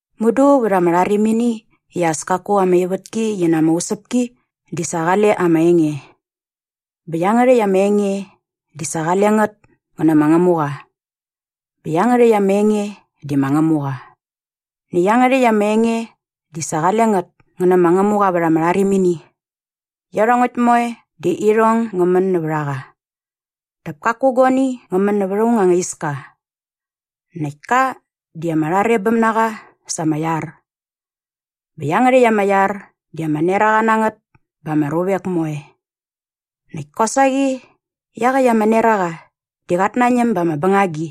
Mudu vät ama rharimini i as kaku ama ivätki qi na ama usäpki di sa qale ama Enge. Bä iangärhäkt ama Enge di sa qale ngät ngä nä ma Ngämuqa. Bä iangärhäkt ama Enge di ma Ngämuqa. Näkt iangärhäkt ama Enge di sa qale ngät ngä nä ma Ngämuqa vät ama rharimini. Iarhongäkt moe di irhong ngä män nävät a qa. Dap kaku guani ngä män näva aung anga iska. Näkt ka di ama rharebäm na qa sa ama iar. Bä iangärhäkt ama iar di ama neraqa na ngät ba ama ruvek moe. Näkt kosaqi iaqäkt ama neraqa di qat nañäm ba ama bängagi.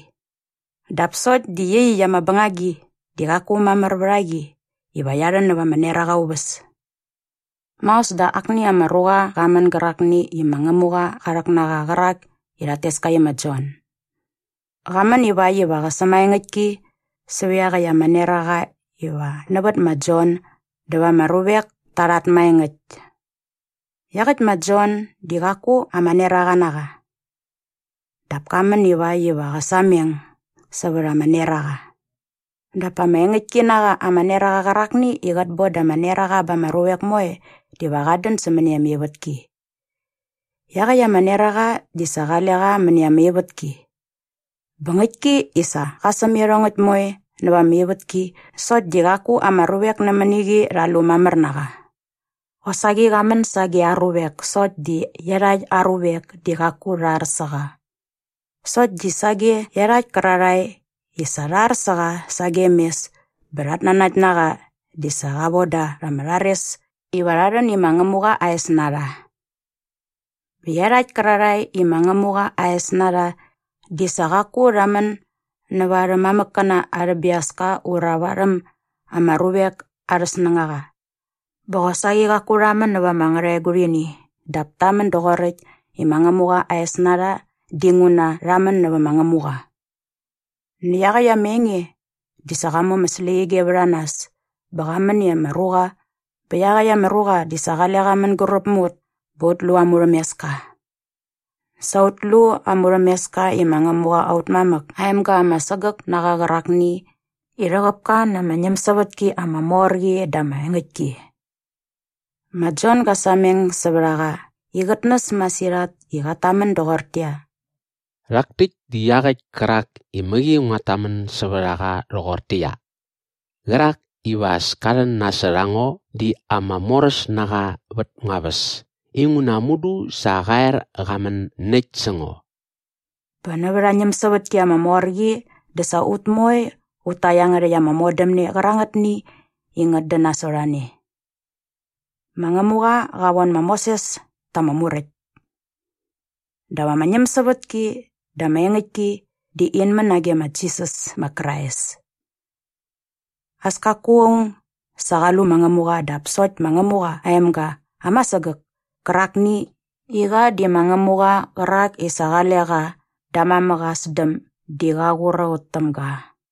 Dap sokt di iaqyäkt ama bängagi di qaku mamär vät a qi iva qia rhän näva ama neraqa aa uväs. Maos dä akni ama ruqa qa män gärakni i ma Ngämuqa qa rhäk na qa qärak i rhat tes ka i ma Jon. Qa män iväkt iva qä sämaengäktki sävät iaqäkt ama neraqa iva nävät ma Jon dä va ama ruvek ta rhat maengäkt. Iaqäkt ma Jon di qaku ama neraqa na qa. Dap ka män iväkt iva qä sameng sävät ama neraqa. Dap ama engäktki na qa ama neraqa qärakni i qät boda ama neraqa ba ama ruvek moe diva qat dän sämäni ama ivätki. Iaqäkt ama neraqa di sa qale qa mäni ama ivätki. Bä ngäktki i sa qa säm iarhongäkt moe nävät ama ivätki sokt di qaku ama ruvek nämäni qi rha lu mamär na qa. Qosaqi qa män sage aa ruvek sokt di iarhakt aa ruvek di qaku rha ar sä qa. Sokt di sage iarhakt kärarhae i sa rha ar sä qa sagem mes bä rhat nanakt na qa di sa qa voda rha ama rhares iva rha rhän i ma Ngämuqa aa es na rha. Bä iarhakt kärarhae i ma Ngämuqa aa es na rha di sa qaku rha män nävät arhä mamäkkäna arhä biaska ura varhäm ama ruvek arhä snängaqa. Bä qosaqi qaku rha män nävät ama ngärhaegurhini dap ta män doqoräkt i ma Ngämuqa aa es na rha dinguna rha män nävä ma Ngämuqa. Näkt iaqäkt ama Enge di sa qa mu ama släqyige vät a nas bä qa män i ama ruqa bä iaqäkt ama ruqa di sa qale qa mänguräp mä ut bä ut lu aa murhämeska. Sa ut lu aa murhämeska i ma Ngämuqa aut mamäk aa emga ama sägäk na qa qärakni i rhäqäp ka na ama ñämsävätki ama mor qi dä na ama engäktki. Ma Jon ga sameng sävät a qa i qät näs masirhat i qat tamän doqortäqyia, “Rhak täkt di iaqäkt kärak i mäqi nguat tamän sävät a qa rhoqortäqyia, ‘Qärak iva as ka rhän nasot a ngo di ama moräs na qa vät ngua väs inguna mudu sa qa er qa män näkt sä ngo.’” Bä nävät aa ñämsävätki ama mor qi dä sa ut moe ut ta iangärhäkt ama modämne qärangätni i ngät dän nasot a ne. Ma Ngämuqa qa von ma Moses ta ama Muräkt. Dap ama ñämsävätki dä ama engäktki di in män nage ma Jisas ma Krais. As kaku aung sa qa lu ma Ngämuqa dap sokt ma Ngämuqa aa emga ama sägäk kärakni i qa di ma Ngämuqa qärak i sa qale qa da aa mamäk aa sdäm di qa qur a ut täm ga.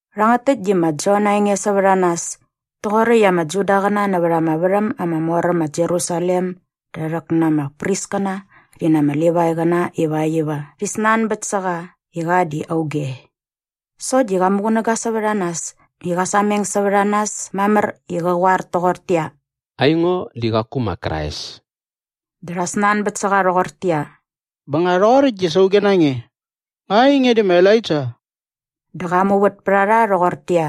Rhangät täkt di ma Jon aa enge sävät a nas toqoräkt i ama Judaqäna näva ama värhäm ama mor äm ma Jerusalem da rhäk na ama priskäna rhi na ama Livaiqäna ivakt iva rhi snanbät sä qa i qa di auge. Sokt di qa muqunäga sävät a nas i qa sameng sävät a nas mamär i qä qoar toqortäqyia, “Aingo di qaku ma Krais.” Dä rha snanbät sä qa rhoqortäqyia, “Bä nga rhoqoräkt dä sa auge na nge? Nga ainge di ma Elaija?” Dä qa muvät pät a rha rhoqortäqyia,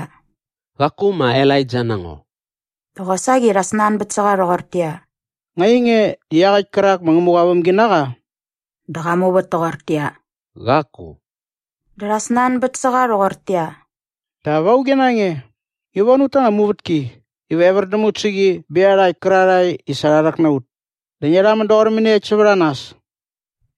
“Qaku ma Elaija na ngo.” Dä qosaqi rha snanbät sä qa rhoqortäqyia, “Nga ainge di iaqäkt kärak ma Ngämuqa aa vämginaqa?” Dä qa muvät toqortäqyia, “Qaku.” Dä rha snanbät sä qa rhoqortäqyia, “Dap auge na nge? Ngi von ut ta anga muvätki iva evär däm ut sä qi bä iarhakt kärarhae i sa rha rhäk na ut. Dä ngia rhamän doqor mäniekt sävät a nas?”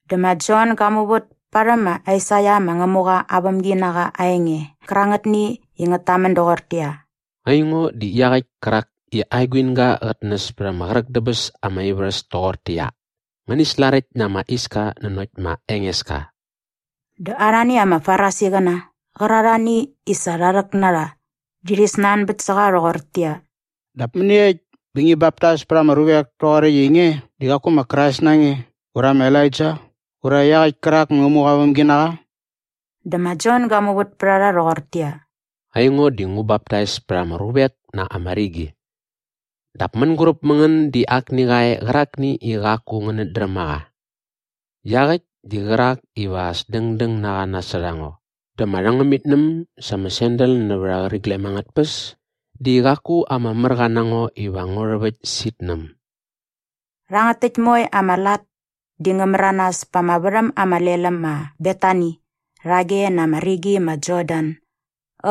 Dä ma Jon ga muvät parhäm ma Aisaia ma Ngämuqa aa vämginaqa aa enge qärangätni i ngät tamän doqortäqyia, “Aingo di iaqäkt kärak i aa eguinga qät näs pät ama qräk dä bäs ama ivärhäs toqortäqyia, ‘Ngäni slaräkt na ama iska nanokt ma Engeska.’” Dä arhani ama Farisiqäna qärarhani i sa rha rhäk na rha di rhi snanbät sä qa rhoqortäqyia, “Dap mäniekt bä ngi baptais pät ama ruvek toqoräkt i nge di qaku ma Krais na nge ura ma Elaija ura iaqäkt kärak ma Ngämuqa aa vämginaqa?” Dä ma Jon ga muvät pät a rha rhoqortäqyia, “Aingo di ngu baptais pät ama ruvek na ama rigi. Dap mänguräp mä ngän di akni qa e qärakni i qaku ngänät dräm a qa. Iaqäkt di qärak iva as dängdäng na qa nasot a ngo dä ama rhängämitnäm sa ama sandal nävät aa qäriglem angät tpäs di qaku ama märqa na ngo iva ngu rhäväkt sä itnäm.” Rhangät täkt moe ama lat di ngä märanas pa ama värhäm ama lel äm ma Betani rhage na ama rigi ma Jordan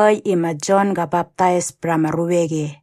äkt i ma Jon gä baptais pät ama ruvek e.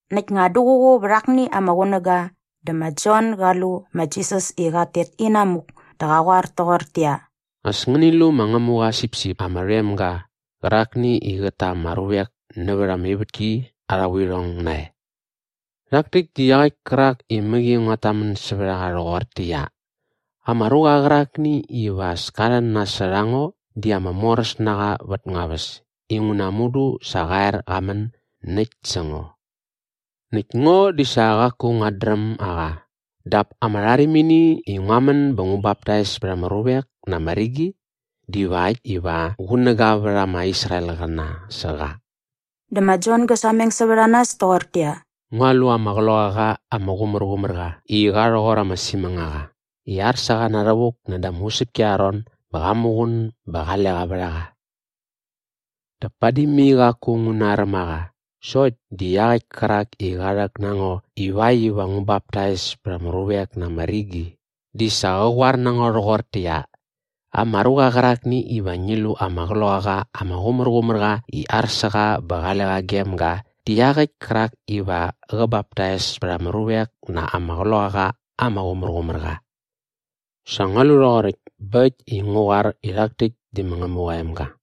Näkt nga duququ vät akni ama qunäga dä ma Jon ga lu ma Jisas i qat tet inamuk dä qa qoar toqortäqyia, “As ngäni lu ma Ngämuqa aa sipsip ama rhoem ga qärakni i qät ta ama ruvek nävät ama ivätki arha vuirhong nae. Rhak täkt di iaqäkt kärak i mäqi nguat tamän sävät a qa rhoqortäqyia, ‘Ama ruqa qärakni iva as ka rhän nasot a ngo di ama moräs na qa vät ngua väs inguna mudu sa qa er qa män näkt sä ngo.’ Näkt ngo di sa qaku nguat dräm a qa dap ama rharimini i ngua män bä ngu baptais pät ama ruvek na ama rigi divakt iva qunäga vät ama Israelqäna sä qa.” Dä ma Jon gä sameng sävät a nas toqortäqyia, “Ngua lu ama Qloqaqa ama Qumärqumärqa i qa rhoqor ama simängaqa i ar sä qa na rhävuk nädä ama usäpki arha ron bä qa muqun bä qale qa vät a qa. Dap padi mai qaku ngu naräm a qa sokt di iaqäkt kärak i qa rhäk na ngo ivakt iva ngu baptais pät ama ruvek na ama rigi di sa qa qoar na ngo rhoqortäqyia, ‘Ama ruqa qärakni iva ngi lu ama Qloqaqa ama Qumärqumärqa i ar sä qa bä qale qa gem ga di iaqäkt kärak iva qä baptais pät ama ruvek na ama Qloqaqa ama Qumärqumärqa.’ Sa ngua lu rhoqoräkt bä äkt i ngu qoar i rhak täkt di ma Ngämuqa aa emga.”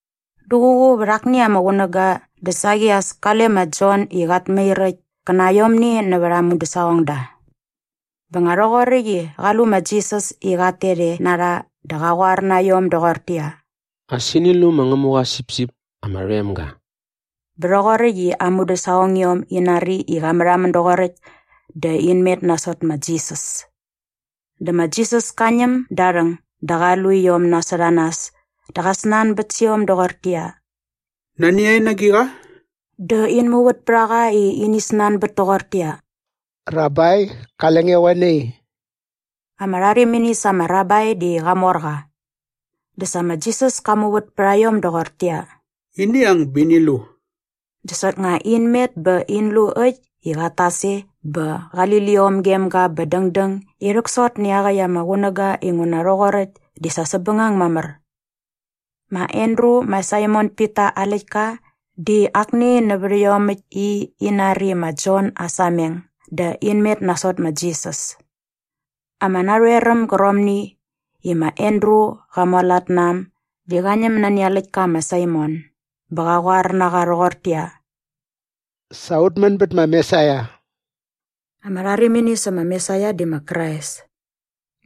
Duququ vät akni ama qunäga dä saqi as kale ma Jon i qat mair äkt kä na aiomni nävät aa mudäsaqongda. Bä nga rhoqoräkt i qa lu ma Jisas i qat tet e na rha dä qa qoar na iom doqortäqyia, “As ini lu ma Ngämuqa aa sipsip ama rhoem ga.” Bä rhoqoräkt i aa mudäsaqongiom in nari i qa märhamän doqoräkt dä in met nasot ma Jisas. Dä ma Jisas ka ñäm da aa rhäng dä qa lu iom nasot a nas dä qa snanbät sä iom doqortäqyia, “Nani a en na agiqa?” Dä in muvät pät a qa i ini snanbät toqortäqyia, “Rabai, qale nge qoe nai?” Ama rharimini sa ama rabai di qamorqa. Dä sa ma Jisas ka muvät pät a iom doqortäqyia, “Ini ang bä ini lu.” Dä soknga in met bä in lu äkt i qat tas e bä qali liom gem ga bä dängdäng i rhäksot nä iaqäkt ama qunäga inguna rhoqoräkt di sa säpbängang mamär. Ma Andru ma Saimon Pita aa läktka di akni nävät iomäkt i in nari ma Jon aa sameng dä in met nasot ma Jisas. Ama narhoeräm gärqomni i ma Andru qa mualat na äm di qa ñäm nani aa läktka ma Saimon bä qa qoar na qa rhoqortäqyia, “Sa ut män bät ma Mesaia.” Ama rharimini sä ma Mesaia di ma Krais.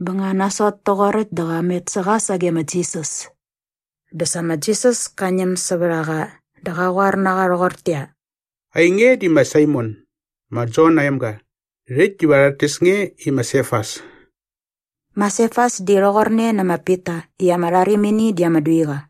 Bä nga nasot toqoräkt dä qa met sä qa sage ma Jisas. Dä sa ma Jisas ka ñäm sävät a qa dä qa qoar na qa rhoqortäqyia, “Ainge di ma Saimon, ma Jon aa emga. Rhäkt diva rhat tes nge i ma Sefas.” Ma Sefas di rhoqorne nä ma Pita i ama rharimini di ama duiqa.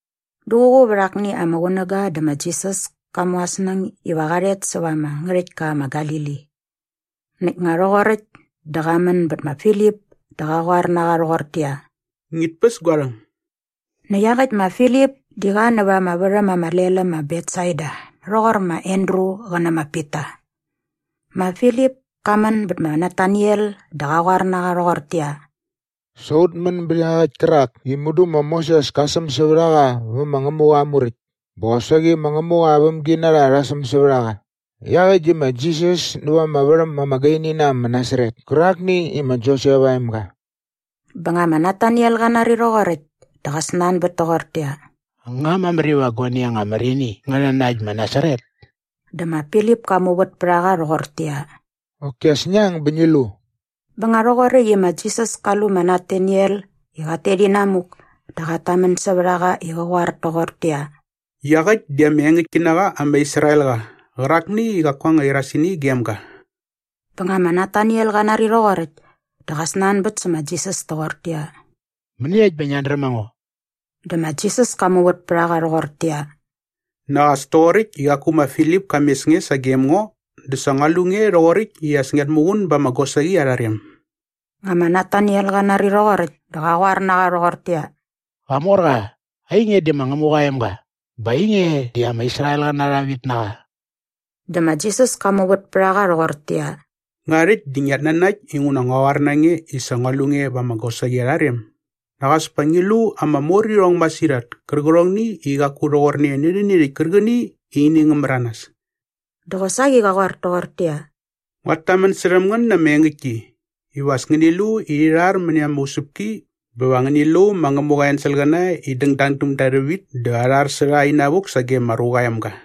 Duququ vät akni ama qunäga dä ma Jisas ka mu aa snäng iva qa rhet säva ama ngärhäktka ma Galili. Näkt nga rhoqoräkt dä qa män bät ma Filip dä qa qoar na qa rhoqortäqyia, “Ngit päs gua rhäng.” Näkt iaqäkt ma Filip di qa näva ama värhäm ama lel äm ma Betsaida rhoqor ma Andru qä nä ma Pita. Ma Filip ka män bät ma Nataniel dä qa qoar na qa rhoqortäqyia, “Sa ut män bät iaqäkt kärak i mudu ma Moses ka säm sävät a qa vä ma Ngämuqa aa Muräkt bä qosaqi ma Ngämuqa aa vämginarha rha säm sävät a qa. Iaqäkt di ma Jisas näva ama värhäm ama gaini na äm ma Nasaret kärakni i ma Josep aa emga.” Bä nga ma Nataniel qa nari rhoqoräkt dä qa snanbät toqortäqyia, “Nga mamär iva guani anga mär ini ngä rhän na äkt ma Nasaret?” Dä ma Filip ka muvät pät a qa rhoqortäqyia, “Qoki as ngi ang bä ngi lu.” Bä nga rhoqoräkt i ma Jisas ka lu ma Nataniel i qat tet inamuk dä qat tamän sävät a qa i qä qoar toqortäqyia, “Iaqäkt di ama engäktki na qa ama Israelqa qärakni i qaku anga irasini gem ga.” Bä nga ma Nataniel qa nari rhoqoräkt dä qa snanbät sä ma Jisas toqortäqyia, “Mäniekt bä ngiat dräm a ngo?” Dä ma Jisas ka muvät pät a qa rhoqortäqyia, “Nak as toqoräkt i qaku ma Filip ka mes nge sagem ngo dä sa ngua lu nge rhoqoräkt i as ngiat muqun ba ama gosaqi arha rem.” Nga ma Nataniel qa nari rhoqoräkt dä qa qoar na qa rhoqortäqyia, “Qamorqa, ainge di ma Ngämuqa aa emga bä ainge di ama Israelqäna arha vitnaqa.” Dä ma Jisas ka muvät pät a qa rhoqortäqyia, “Nga rhäkt di ngiat nanakt inguna ngua qoar na nge i sa ngua lu nge va ama gosaqi arha rem? Nak as pa ngi lu ama morirhong masirhat kärqärhongni i qaku rhoqorne nä rhäni rhäkt kärqäni i ini ngä märanas.” Dä qosaqi qa qoar toqortäqyia, “Nguat tamän särhäm ngän na ama engäktki iva as ngäni lu i rhi rhar mäni ama usäpki bä va ngäni lu ma Ngämuqa aa enselqäna i dängdang däm da rhävit dä arhar sä rha inavuk sage ma Ruqa aa Emga.”